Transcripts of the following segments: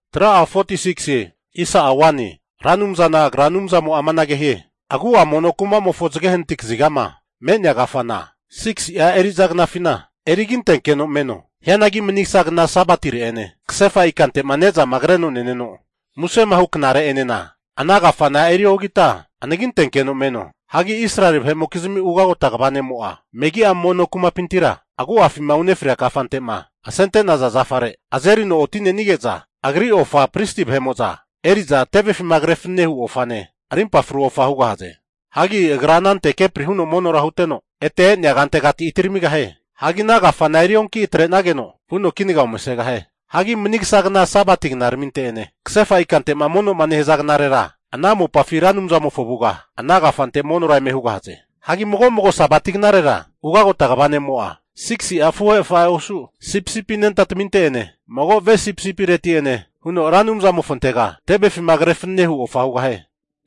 Ra Anumzana Agra Anumzamo'a amanage hie, Agu'a mono kumamofo zage hanati kazigama me'nea kafana 6si'a eri'za knafina eriginteno meno. Hianagi manigasa kna Sabatire'ene kasefa ikante'ma ne'zama kreno neneno musema hu knare'enena ana kafana eriogita anagintenkeno meno. Hagi Israeli vahe'mokizimi ugagota kva ne'mo'a, megi'a mono kumapintima agu'afima unefrea kafante'ma asente'naza zafare azerino oti'nenige'za agri ofa pristi vahe'mo'za eri'za tevefima kre fananehu ofane, arimpa fru ofa hugahaze. Hagi agra anante kepri huno monora huteno, ete e'nea kantegati atiramigahie. Hagi ana kafana erionki atre'nageno vuno kinaga omasegahie. Hagi manigasa kna Sabati knaraminte'ene kasefa ikante'ma mono'ma nehaza knarera, ana mopafi Ra Anumzamofo avuga ana kafante monora eme hugahaze. Hagi mago mago Sabati knarera ugagota kva ne'mo'a, 6si'a afuhe afahe osu sipisipi anentataminteti'ene mago ve sipisipireti'ene huno Ra Anumzamofontega tevefima kre fananehu ofa hugahie.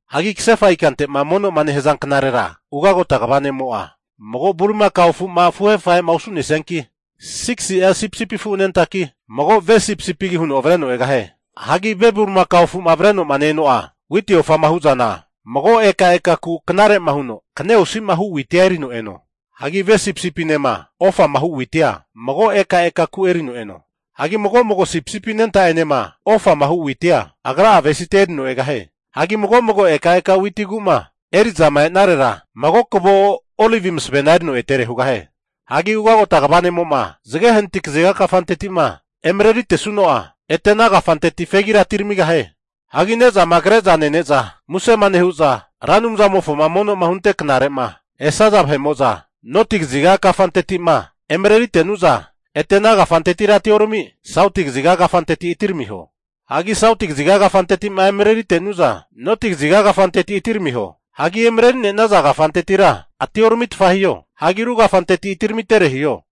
Hagi kasefa ikante'ma mono'ma nehaza knarera ugagota kva ne'mo'a, mago bulimakao afuma afuhe afahe'ma osu'nesianki, 6si'a sipisipi afu anentaki, mago ve sipisipigi huno avreno egahie. Hagi ve bulimakao afu'ma avreno'ma ne-eno'a witi ofama hu zana mago ekaeka ku knare'ma huno kne osi'osi'ma hu witia erino eno. Hagi ve sipisipinema ofama hu witia mago ekaeka ku erino eno. Hagi mago mago sipisipi anenta'enema ofama hu witia agra'a avesite erino egahie. Hagi mago mago ekaeka witi ku'ma eri'zama e'narera, mago kavo olivi masavena erino etere hugahie. Hagi ugagota kva ne'mo'ma zage hanati kaziga kafanteti'ma emareritesuno'a, ete ana kafanteti fegira atiramigahie. Hagi ne'zama kre'za nene'za musema nehu'za Ra Anumzamofoma mono'ma hunte knare'ma esaza vahe'mo'za noti kaziga kafanteti'ma emarerite'nu'za, ete ana kafantetira atiorami, sauti kaziga kafanteti atiramiho. Hagi sauti kaziga kafanteti'ma emarerite'nu'za noti kaziga kafanteti atiramiho. Hagi emareri'nenaza kafantetira atioramitfa hiho. Hagi ru kafanteti atiramitere hiho.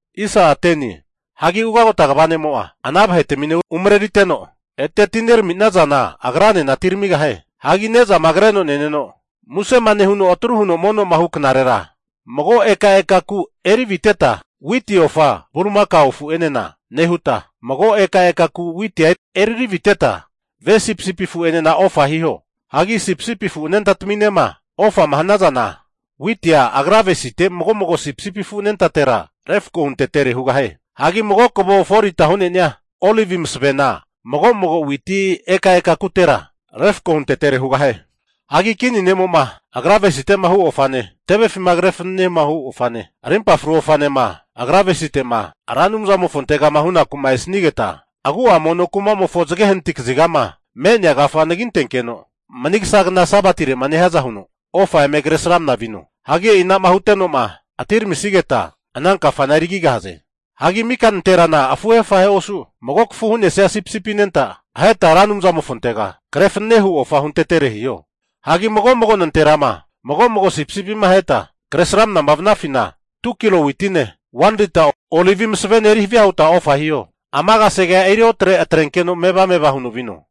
Hagi ugagota kva ne'mo'a ana vahetamine umareriteno, ete atinerami'nazana agra'enena atiramigahie. Hagi nezama kreno neneno musema nehuno atru huno mono'ma hu knarera, mago ekaeka ku eriviteta witi ofa bulimakao afu'enena nehuta, mago ekaeka ku witia eriri aviteta ve sipisipi afu'enena ofa hiho. Hagi sipisipi afu anentataminema ofama hanazana, witia agra avesite mago mago sipisipi afu anentatera refko huntetere hugahie. Hagi mago kavo 4lita hu'nenia olivi masavena mago mago witi ekaeka kutera refko huntetere hugahie. Hagi kini ne'mo'ma agra avesite'ma hu ofane, tevefima kre fananehu ofane, arimpa fru ofanema agra avesite'ma Ra Anumzamofontegama hunaku'ma esanigeta, agu'a mono kumamofo zage hanati kazigama me'nea kafa anagintenkeno, manigasa kna Sabatire'ma nehiaza huno ofa eme Kresramana vino. Hagi e'i ana'ma huteno'ma atiramisigeta ana kafana erigigahaze. Hagi mika nanterana afuhe afahe osu, mago kafu hu'nesia sipisipi anenta aheta Ra Anumzamofontega kre fanenehu ofa huntetere hiho. Hagi mago mago nanterama mago mago sipisipima aheta kre sramana vanafina 2kilo witine 1lita olivi masavene eri havia huta ofa hiho. Ama kasegea eriotre atrenkeno meva meva huno vino.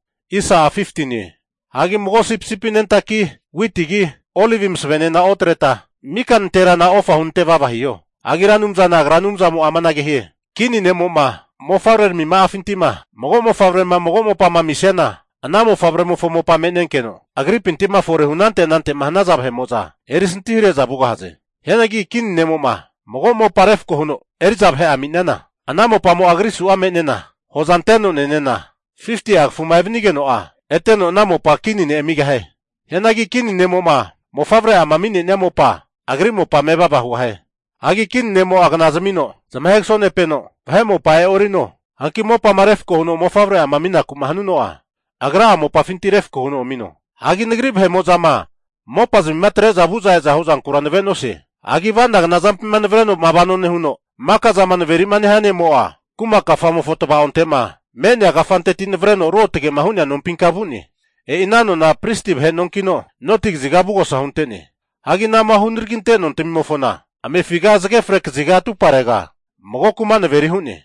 Hagi mago sipisipi anentaki witigi, olivi masavena otreta mika nanterana ofa hunante vava hiho. Hagi Ra Anumzana Agra Anumzamo'a amanage hie, kini ne'mo'ma mofavrerami ma'afinti'ma mago mofavre'ama mago mopama amisiana, ana mofavremofo mopa me'nenkeno agripinti'ma forehu anante anante'ma hanaza vahe'mo'za erisantihare'za vugahaze. Hianagi kini nemo'ma mago mopama refko huno eri'za vahe'ama ami'niana, ana mopamo'a agrisu'a me'nena hoza anteno nenena 50'a kafuma evanigeno'a, eteno ana mopa kini ne' amigahie. Hianagi kini ne'mo'ma mofavre'ama ami'nenia mopamo'a agri mopa mevava hugahie. Hagi kini ne'mo'a vahera knazmino zamahe kasonepeno, vahe mopa e'orino. Hanki mopama refko huno mofavre'ama aminaku'ma hanuno'a, agra'a mopafinti refko huno amino. Hagi Nagri vahe'mo'zama mopazmima atre'za vu'za eza huzankura nave'nosie. Hagi avanagana zampima navareno'ma vanoma nehuno maka zama naveri'ma nehia ne'mo'a, kuma kafamofo tavaonte'ma me'nea kafanteti navareno ruotge'ma hu'nea nompinka vu'ne. E'i ana nona pristi vahe nonkino, noti kaziga avugosa huntene. Hagi anama hunaraginte nontamimofona, amefiga zage fre kaziga atumparega mago kuma naveri hu'ne.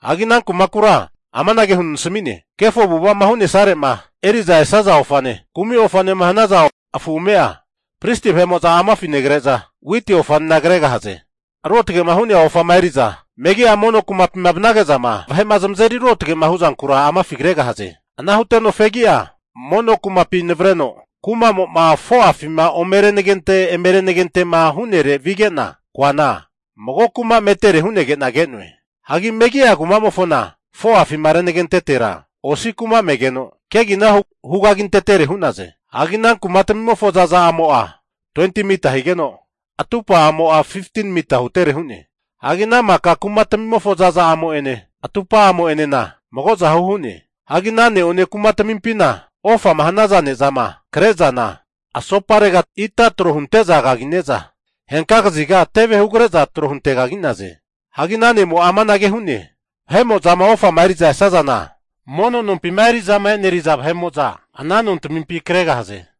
Hagi ana kumakura amanage huno nasami'ne, Kefo avu'ava'ma hu'nesare'ma eri'za esaza ofane, kumi ofanema hanaza afu ame'a pristi vahe'mo'za amafi negre'za, witi ofanena kregahaze. Ruotge'ma hu'nea ofama eri'za megi'a mono kumapima vanage'zama vahe'ma zamazeri ruotge'ma huzankura amafi kregahaze. Ana huteno fegi'a mono kumapi navareno kuma'mo'ma 4'afima omerenagente eme renagente'ma hu'nere vige'na koana, mago kuma metere hu'negena ke'noe. Hagi megi'a kumamofona 4'afima renagentetera osi kuma megeno, kegina hugagintetere hu'naze. Hagi ana kumatamimofo zaza'amo'a 20mita higeno, atupa'amo'a 15mita hutere hu'ne. Hagi ana maka kumatmimofo zaza'amo'ene atupa'amo'enena magozahu hu'ne. Hagi ana ne'one kumatamipina ofama hanaza ne'zama kre'zana asoparega ita tro hunte'za kagine'za, henka kaziga teve hugre'za tro huntekagi'naze. Hagi ana ne'mo'a amanage hu'ne, vahe'mo'zama ofama eri'za esazana, mono nompima eri'zama e'neriza vahe'mo'za ana nontamimpi kregahaze.